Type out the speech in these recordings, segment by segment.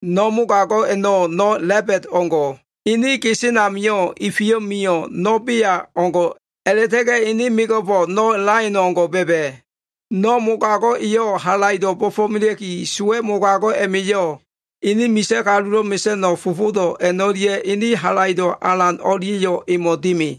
No mogago꞉ a꞉no꞉ busi alano꞉ o꞉ngo꞉. Ene gesen amio꞉ ifi mio꞉wo꞉ no꞉ bea o꞉ngo꞉, a꞉la꞉ta꞉ga꞉ ene mego꞉fo꞉ no꞉ laion o꞉ngo꞉ ba꞉ba꞉. No꞉ mogago꞉ eyo꞉ halaido꞉ bo꞉fo꞉melea꞉ki, sowa꞉ mogago꞉ a꞉ma꞉yo꞉, ene misa꞉ kalulo꞉ mesa꞉no꞉ fofodo꞉ a꞉no꞉lia꞉, ene halaido꞉ alan o꞉lia꞉yo꞉ emo꞉ dimi.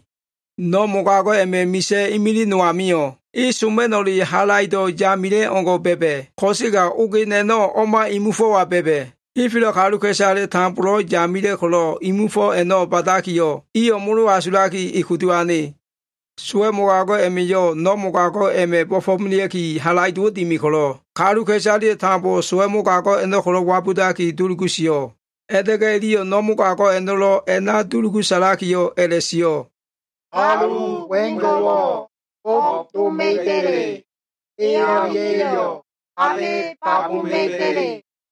No꞉ mogago꞉ a꞉ma꞉ misa꞉ imilig no amio꞉, e soma꞉no꞉le halaido꞉ yamila꞉ o꞉ngo꞉ ba꞉ba꞉, ko꞉sega ogen a꞉no꞉ o꞉ma imu fo꞉wa ba꞉ba꞉. Henfelo꞉ kaluka꞉isale tambolo꞉ yamila꞉ ko꞉lo꞉, imu fo a꞉no꞉ ba꞉dakiyo꞉ iyo꞉ molo asulaki, e kudu ane. Sowa꞉ mogago꞉ a꞉ma꞉yo꞉ no꞉ mogago꞉ a꞉ma꞉ bo꞉fo꞉melea꞉ki halaido꞉wo꞉ dimi ko꞉lo꞉, kaluka꞉isaleyo꞉ tambo sowa꞉ mogago꞉ a꞉no꞉ ko꞉lo꞉ wabudaki dulugu sio꞉. A꞉la꞉ta꞉ga꞉ iliyo꞉ no꞉ mogago꞉ a꞉no꞉lo꞉ a꞉na dulugu sa꞉lakiyo꞉ a꞉la꞉sio꞉, “Kalu wengo꞉wo꞉ o꞉b doma꞉iba꞉le? E o꞉lia꞉yo꞉ abe babuma꞉iba꞉le?”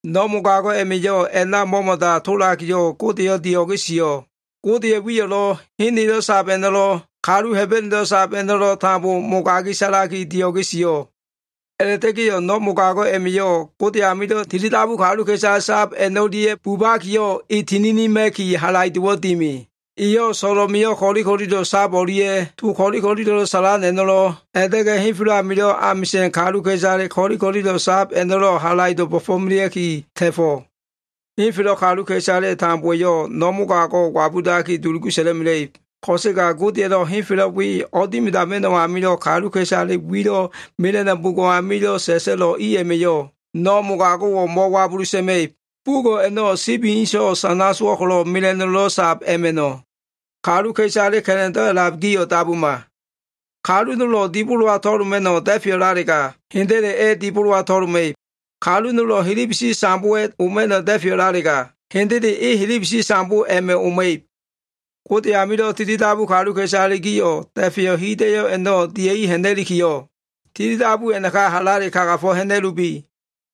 No꞉ mogago꞉ a꞉ma꞉yo꞉ a꞉na mo꞉mo꞉da tolakiyo꞉, Godeyo꞉ dio꞉ge sio꞉. Godeya꞉ wiyo꞉lo꞉, hen elo꞉ a꞉lab a꞉no꞉lo꞉, kalu Hebenelo꞉ sab a꞉no꞉lo꞉ tambo mogagi sa꞉laki dio꞉ge sio꞉. A꞉la꞉ta꞉ga꞉yo꞉ no꞉ mogago꞉ a꞉ma꞉yo꞉ Gode amilo꞉ tilidabu kaluka꞉isale sab a꞉no꞉lia꞉ bubakiyo꞉, e tininima꞉ki halaido꞉wo꞉ dimi. Eyo꞉ so꞉lo꞉ mio꞉ ko꞉li ko꞉lilo꞉ sab o꞉lia꞉, to ko꞉li ko꞉lilo꞉lo꞉ sa꞉lan a꞉no꞉lo꞉, a꞉la꞉ta꞉ga꞉ henfelo꞉ amilo꞉ amisa꞉n kaluka꞉isale ko꞉li ko꞉lilo꞉ sab a꞉no꞉lo꞉ halaido꞉ bo꞉fo꞉melea꞉ki ta꞉fo꞉. Henfelo꞉ kaluka꞉isale tambowa꞉yo꞉ no꞉ mogago꞉wo꞉ wabudaki, dulugu sa꞉la꞉mela꞉ib. Ko꞉sega Godeya꞉lo꞉ henfelo꞉ we o꞉dimidama꞉no꞉ amilo꞉ kaluka꞉isale wilo꞉ mela꞉no꞉ bugo꞉ amilo꞉ sa꞉sa꞉lo꞉ i a꞉ma꞉yo꞉, no꞉ mogago꞉wo꞉ mo꞉wabulu sa꞉ma꞉ib. Bugo꞉ a꞉no꞉ sibi inso꞉ sana sowo꞉ ko꞉lo꞉ mela꞉no꞉lo꞉ sab a꞉ma꞉no꞉. Kaluka꞉isale ka꞉la꞉ndo꞉ a꞉lab gio꞉ dabuma. Kalu nolo꞉ dibolowa to꞉loma꞉no꞉ da꞉feyo꞉lalega, hendele e dibolowa to꞉loma꞉ib. Kalu nolo꞉ helebesi sambowa꞉ oma꞉no꞉ da꞉feyo꞉lalega, hendele e helebesi sambo a꞉ma꞉ oma꞉ib. Gode amilo꞉ tilidabu kaluka꞉isale gio꞉ da꞉feyo꞉ hida꞉yo꞉ a꞉no꞉ dia꞉i ha꞉na꞉likiyo꞉, tilidabu a꞉naka halale kagafo꞉ ha꞉na꞉lubi.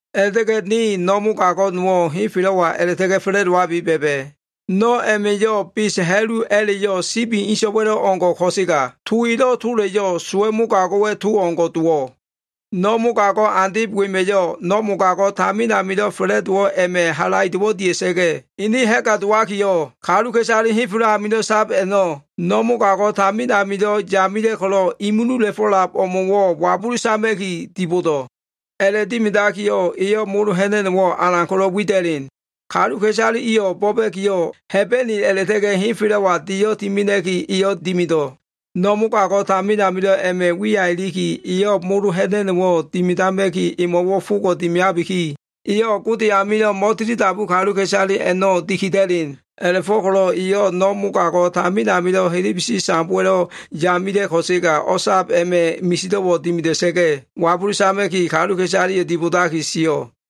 A꞉la꞉ta꞉ga꞉yo꞉ ne no꞉ mogago꞉ nowo꞉ henfelo꞉wa a꞉la꞉ta꞉ga꞉ fa꞉la꞉dowabi ba꞉ba꞉. No꞉ a꞉ma꞉yo꞉ bes ha꞉lu a꞉la꞉yo꞉, sibi inso꞉wa꞉lo꞉wo꞉ o꞉ngo꞉ ko꞉sega, to elo꞉ tola꞉yo꞉ sowa꞉ mogago꞉wa꞉ to o꞉ngo꞉ dowo꞉. No꞉ mogago꞉ andeb wema꞉yo꞉, no꞉ mogago꞉ tamin amilo꞉ fa꞉la꞉dowo꞉ a꞉ma꞉ halaido꞉wo꞉ dia꞉sa꞉ga꞉, ene ha꞉ga dowakiyo꞉, kaluka꞉isale henfelo꞉ a꞉namilo꞉ sab a꞉no꞉, no꞉ mogago꞉ tamin amilo꞉ yamila꞉ ko꞉lo꞉ imulula꞉fo꞉lab o꞉mo꞉wo꞉ wabulu sama꞉ki dibodo꞉. A꞉la꞉dimidakiyo꞉, eyo꞉ molo ha꞉na꞉no꞉wo꞉ alan ko꞉lo꞉ wida꞉len. Kaluka꞉isale iyo꞉ bo꞉ba꞉kiyo꞉, Hebene a꞉la꞉ta꞉ga꞉ henfelo꞉wa deyo꞉ timena꞉ki, eyo꞉ dimido꞉. No꞉ mogago꞉ tamin amilo꞉ a꞉ma꞉ wiya iliki, eyo꞉ molo ha꞉na꞉no꞉wo꞉ dimidama꞉ki emo꞉wo꞉ fogo꞉ dimiabiki, eyo꞉ Gode amilo꞉ mo꞉tilidabu kaluka꞉isale a꞉no꞉ dikida꞉len. A꞉la꞉fo꞉ko꞉lo꞉ eyo꞉ no꞉ mogago꞉ tamin amilo꞉ helebesi sambowa꞉ yamila꞉ ko꞉sega o꞉sab a꞉ma꞉ misido꞉wo꞉ dimida꞉sa꞉ga꞉ wabulu sama꞉ki, kaluka꞉isaleyo꞉ dibodakiyo꞉ sio꞉.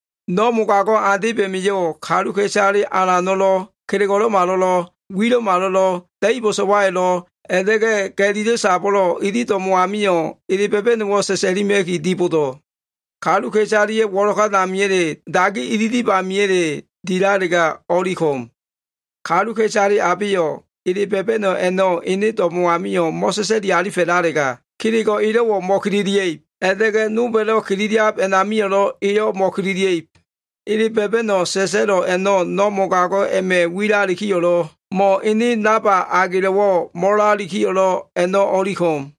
No꞉ mogago꞉ andeb a꞉ma꞉yo꞉ kaluka꞉isale alano꞉lo꞉, kelego꞉lo꞉malo꞉, wilo꞉wo꞉lo꞉, da꞉ibo꞉ so꞉wayo꞉lo꞉, a꞉la꞉ta꞉ga꞉ ga꞉lilo꞉ sabo꞉lo꞉, ili do꞉mo꞉ amio꞉ ele ba꞉ba꞉no꞉wo꞉ sa꞉sa꞉lima꞉ki dibodo꞉. Kaluka꞉isaleya꞉ wo꞉lokan amiya꞉le, dagi ililiba amiya꞉le dilalega o꞉li ko꞉m. Kaluka꞉isale abeyo꞉ ele ba꞉ba꞉no꞉ a꞉no꞉ ene do꞉mo꞉ amio꞉ mo꞉sa꞉sa꞉li alifa꞉lalega, kelego꞉ elo꞉wo꞉ mo꞉kililia꞉ib, a꞉la꞉ta꞉ga꞉ nolba꞉lo꞉ kililiab a꞉namio꞉lo꞉, eyo꞉ mo꞉kililia꞉ib. Ele ba꞉ba꞉no꞉ sa꞉sa꞉lo꞉ a꞉no꞉, no꞉ mogago꞉ a꞉ma꞉ wilalikiyo꞉lo꞉ mo꞉ ene namba agelo꞉wo꞉ mo꞉lalikiyo꞉lo꞉ a꞉no꞉ o꞉li ko꞉m.